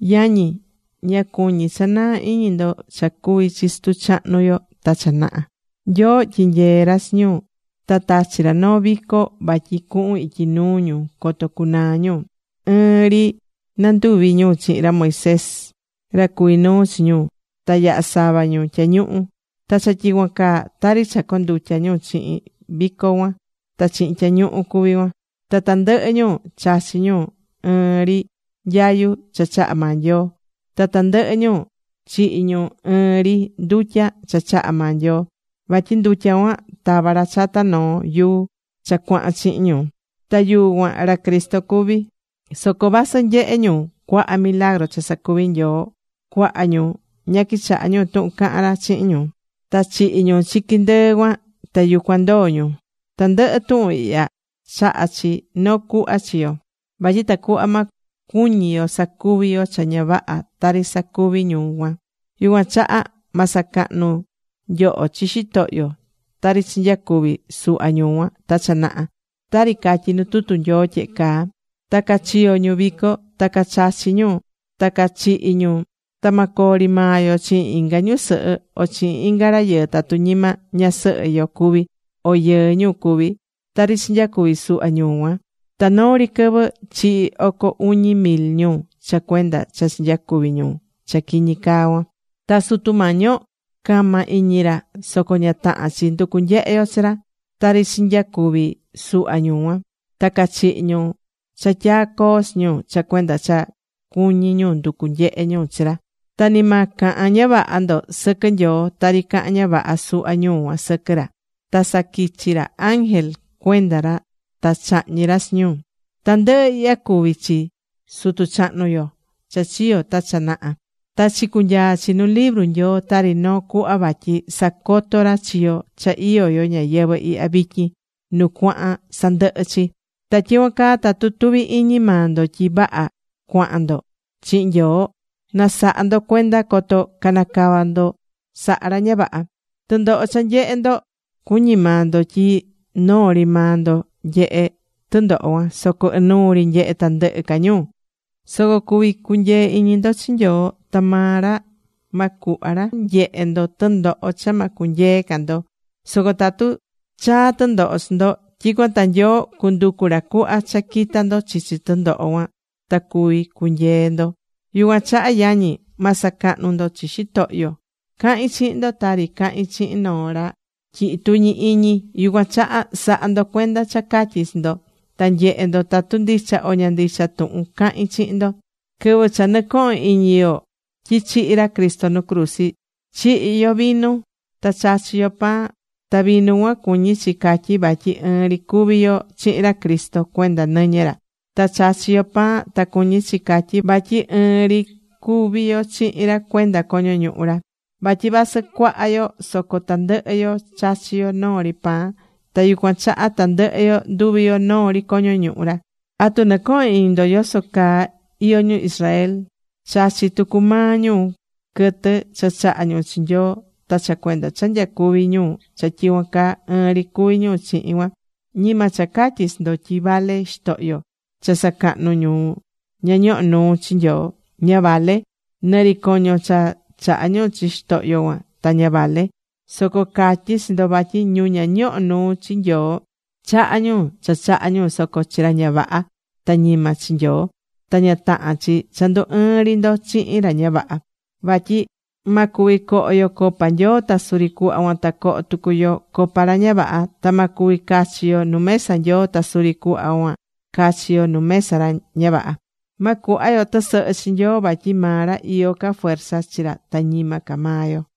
Yañi, ña cuñí cha naa iñi ndo cha cuvi̱ chi sutu chahnu yo ta cha naha̱. Nyoo tyinyee̱ ra chi ñu, ta tachi̱ ra noo vico vatyi cuhun ityi nuu ñu coto cunaa ñu. Ɨɨn ri nanduvi̱ ñu chihin ra Moisés, ra cuví nuu chi ñu, ta yaha̱ sava ñu tyañuhu. Ta cha tyicuan caa, tari cha condutya̱ ñu chihin vico cuan ta chihin tyañuhu cuví cuan. Ta tandɨhɨ ñu chachi̱ ñu ɨɨn ri nyayu cha chaha̱ maa Nyoo. Ta tandɨhɨ ñu chihi̱ ñu ɨɨn ri ndutya cha chaha̱ maa Nyoo. Vatyi ndutya cuan tava̱ ra chata noo yuu cha cuahan chihin ñu. Ta yuu cuan ra Cristo cuví. Soco vasɨ nyehe̱ ñu cuaha milagru cha sacuvi̱ Nyoo, cuaha ñu ña quichaha̱ ñu tuhun caha̱n ra chihin ñu. Ta chihi̱ ñu chiqui ndɨɨ cuan, ta yucuan ndoo̱ ñu. Tandɨhɨ tuhun ihya chahá chi noo cuhva chi yo. Vatyi tacuhva ma cuñi yo sacuvi yo cha ña vaha tari sacuvi̱ ñu cuan. Yucuan chaha ma sacahnu nyoho chi xitohyo, tari chinyacuvi̱ suhva ñu cuan ta cha naha, tari catyí nu tutu Nyoo tyehe caa: “Ta cachiyo̱ ñu vico, ta cachachi̱ ñu, ta cachihi̱ ñu.” Ta ma coo ri maa yo chihin inga ñusɨhɨ o chihin inga rayɨɨ tatu ñima ñasɨhɨ yo cuví, o yɨɨ ñu cuví, tari chinyacuvi̱ suhva ñu cuan. Ta noo ri quɨvɨ chihi̱ oco uñi mil ñu cha cuenda cha chinyacuvi̱ ñu cha quiñi caa cuan. Ta Sutu Mañi yo cama iñi ra, soco ña tahán chi nducú nyehe yo chi ra. Tari chinyacuvi̱ suhva ñu cuan. Ta cachihi̱ ñu cha tyaa̱ coo chi ñu, cha cuenda cha cuñi̱ ñu nducu̱ nyehe ñu chi ra. Ta ni ma cahan ña vaha ndo sɨquɨ Nyoo, tari caha̱n ña vaha suhva ñu cuan sɨquɨ ra. Ta saquichi̱ ra ángel cuenda ra ta chahñi̱ ra chi ñu. Tandɨhɨ ihya cuvi̱ chi sutu chahnu yo cha chiyo̱ ta cha naha. Ta chicunyaa chi nu libru Nyoo tari noo cuhva vatyi sacotó ra chi yo cha iyó yo ñayɨvɨ̱ ihya vityin, nu cuahán sandɨhɨ chi. Ta tyicuan caa tatu tuví iñi maa ndo tyi vaha cuahán ndo chihin Nyoo, na̱saha ndo cuenda coto canacava ndo saha ra ña vaha. Tɨndoho cha nyehé ndo, cuñí maa ndo tyi noo ri maa ndo nyehé tɨndoho cuan. Soco inuu ri nyehé tandɨhɨ ca ñu. Soco cuví cunyee iñi ndo chi Nyoo, ta maa ra ma cuhva ra nyehé ndo tɨndoho cha ma cunyee ca ndo. Soco tatu chaa tɨndoho chi ndo, tyicuan ta Nyoo cunducu ra cuhva cha quita ndo chichi tɨndoho cuan ta cuví cunyee ndo. Yucuan chaha yañi, ma sacahnu ndo chi xitohyo. Cahín chihin ndo tari cahín chihin noo ra tyihí tuñi iñi. Yucuan chaha sa̱ha ndo cuenda cha catyí chi ndo. Ta nye̱he ndo tatu ndicha o ña ndicha tuhun cahín chihin ndo. Quɨvɨ cha nɨcohón iñi yo tyi chihi̱ ra Cristo nu cruzi, chihí yo vinu ta chachí yo pan. Ta vinu cuan cuñí chi catyi vatyi ɨɨn ri cuví yo chihin ra Cristo cuenda nɨñɨ ra. Ta chachi yo pan ta cuñí chi catyi vatyi ɨɨn ri cuví yo chihin ra cuenda coño ñuhu ra. Vatyi vasɨ cuaha yo, soco tandɨhɨ yo chachí yo noo ri pan. Ta yucuan chaha tandɨhɨ yo nduví yo noo ri coño ñuhu ra. ¿Atu nɨcohón iñi ndo yoso caa iyó ñu Israel? Chachí tucu maa ñu quɨtɨ cha chahá ñu chi Nyoo, ta cha cuenda cha nyacuví ñu cha tyicuan caa, ɨɨn ri cuví ñu chihin cuan. Ñima cha catyí chi ndo tyi vale xitohyo cha sacahnú ñu ña ñohó nuu chi Nyoo. Ña vale, nɨ ri coño cha chahá ñu chi xitohyo cuan ta ña vale. Soco catyí chi ndo vatyi ñu ña ñohó nuu chi Nyoo chahá ñu cha chahá ñu, soco chi ra ña vaha. Ta ñima chi Nyoo. Ta ña tahán chi cha ndu ɨɨ́n ri ndo chihin ra ña vaha. Vatyi ma cuvi coho yo copa Nyoo ta suri cuhva cuan ta coho tucu yo copa ra ña vaha. Ta ma cuvi cachi yo nu mesa Nyoo. Ta suri cuhva cuan cachi yo nu mesa ra ña vaha. Ma cuhva yo tɨsɨhɨ chi Nyoo vatyi maa ra iyó ca fuerza chi ra ta ñima ca maa yo.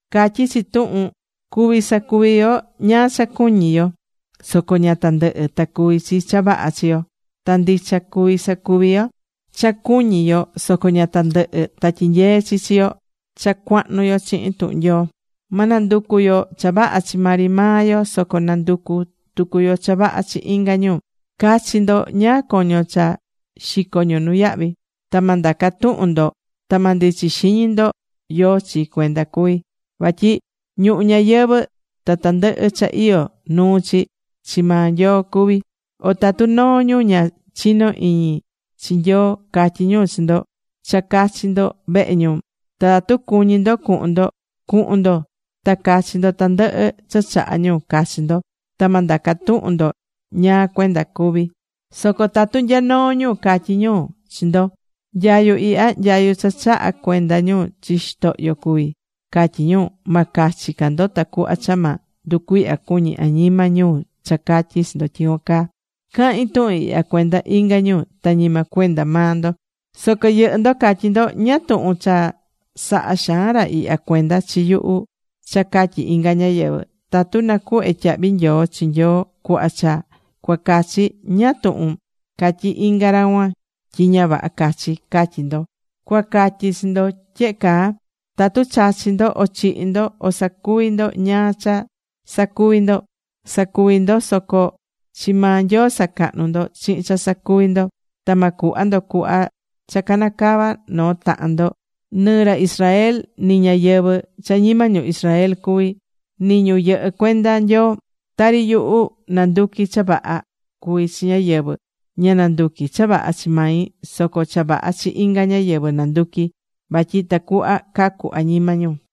Catyí chi tuhun: “Cuví sacuvi yo ñáá cha cuñí yo. Soco ña tandɨhɨ ta cuví chi cha vaha chi yo.” Ta ndicha cuví sacuví yo cha cuñí yo. Soco ña tandɨhɨ ta tyinyeé chi chi yo cha cuahnu yo chihin tuhun Nyoo. Ma nanducu yo cha vaha chi maa ri maa yo, soco na nducu tucu yo cha vaha chi inga ñu. Ca̱chi ndo ñáá coño cha xicó ñu nuyahvi. Ta ma ndaca tuhun ndo ta ma ndichi xiñi ndo yóó chi cuenda cuví. Vatyi ñuhu ñayɨvɨ̱ ta tandɨhɨ cha iyó nuu chi, chi maa Nyoo cuví. O tatu noo ñu ña chinó iñi chi Nyoo, catyí ñu chi ndo cha cucachi ndo vehe ñu, ta tatu cuñí ndo cuhun ndo, cu̱hun ndo ta ca̱chi ndo tandɨhɨ cha chahá ñu cachi ndo. Ta ma ndaca tuhun ndo ñáá cuenda cuví. Soco tatu nya noo ñu catyí ñu chi ndo: “Nyayu ihya nyayu cha chaha̱ cuenda ñu chi xitohyo cuví”, catyí ñu. Ma cachi ca ndo tacuhva cha ma nducuihya cuñi añima ñu cha catyi chi ndo tyicuan caa. Cahín tuhun ihya cuenda inga ñu ta ñima cuenda maa ndo. Soco yɨhɨ́ ndo catyí ndo: “¿Ñáá tuhun cha sahá xaan ra ihya cuenda chi yuhu cha catyi inga ñáyɨvɨ? Tatu nacuhvé tyahvi nyoo chi Nyoo cuhva cha cuacachi, ñáá tuhun catyí inga ra cuan tyi ña vaha cachí”, catyí ndo. Cuacatyi chi ndo tyehe caa, tatu chachí ndo, o chihí ndo, o sacuví ndo ñáá ca cha sacuví ndo, sa̱cuví ndo soco chi maa Nyoo sa̱cahnu ndo chihin cha sacuví ndo. Ta ma cuhva ndo cuhva cha canacavá noo tahan ndo, nɨ ra Israel, nɨ ñáyɨvɨ cha ñima ñu Israel cuvi, nɨ ñu yɨhɨ́ cuenda Nyoo. Tari yuhu, nanduquí cha vaha cuví chi ñáyɨvɨ. Ña nanduquí cha vaha chi mai, soco cha vaha chi inga ñáyɨvɨ nanduquí. Vatyi tacuhva cacu añima ñu.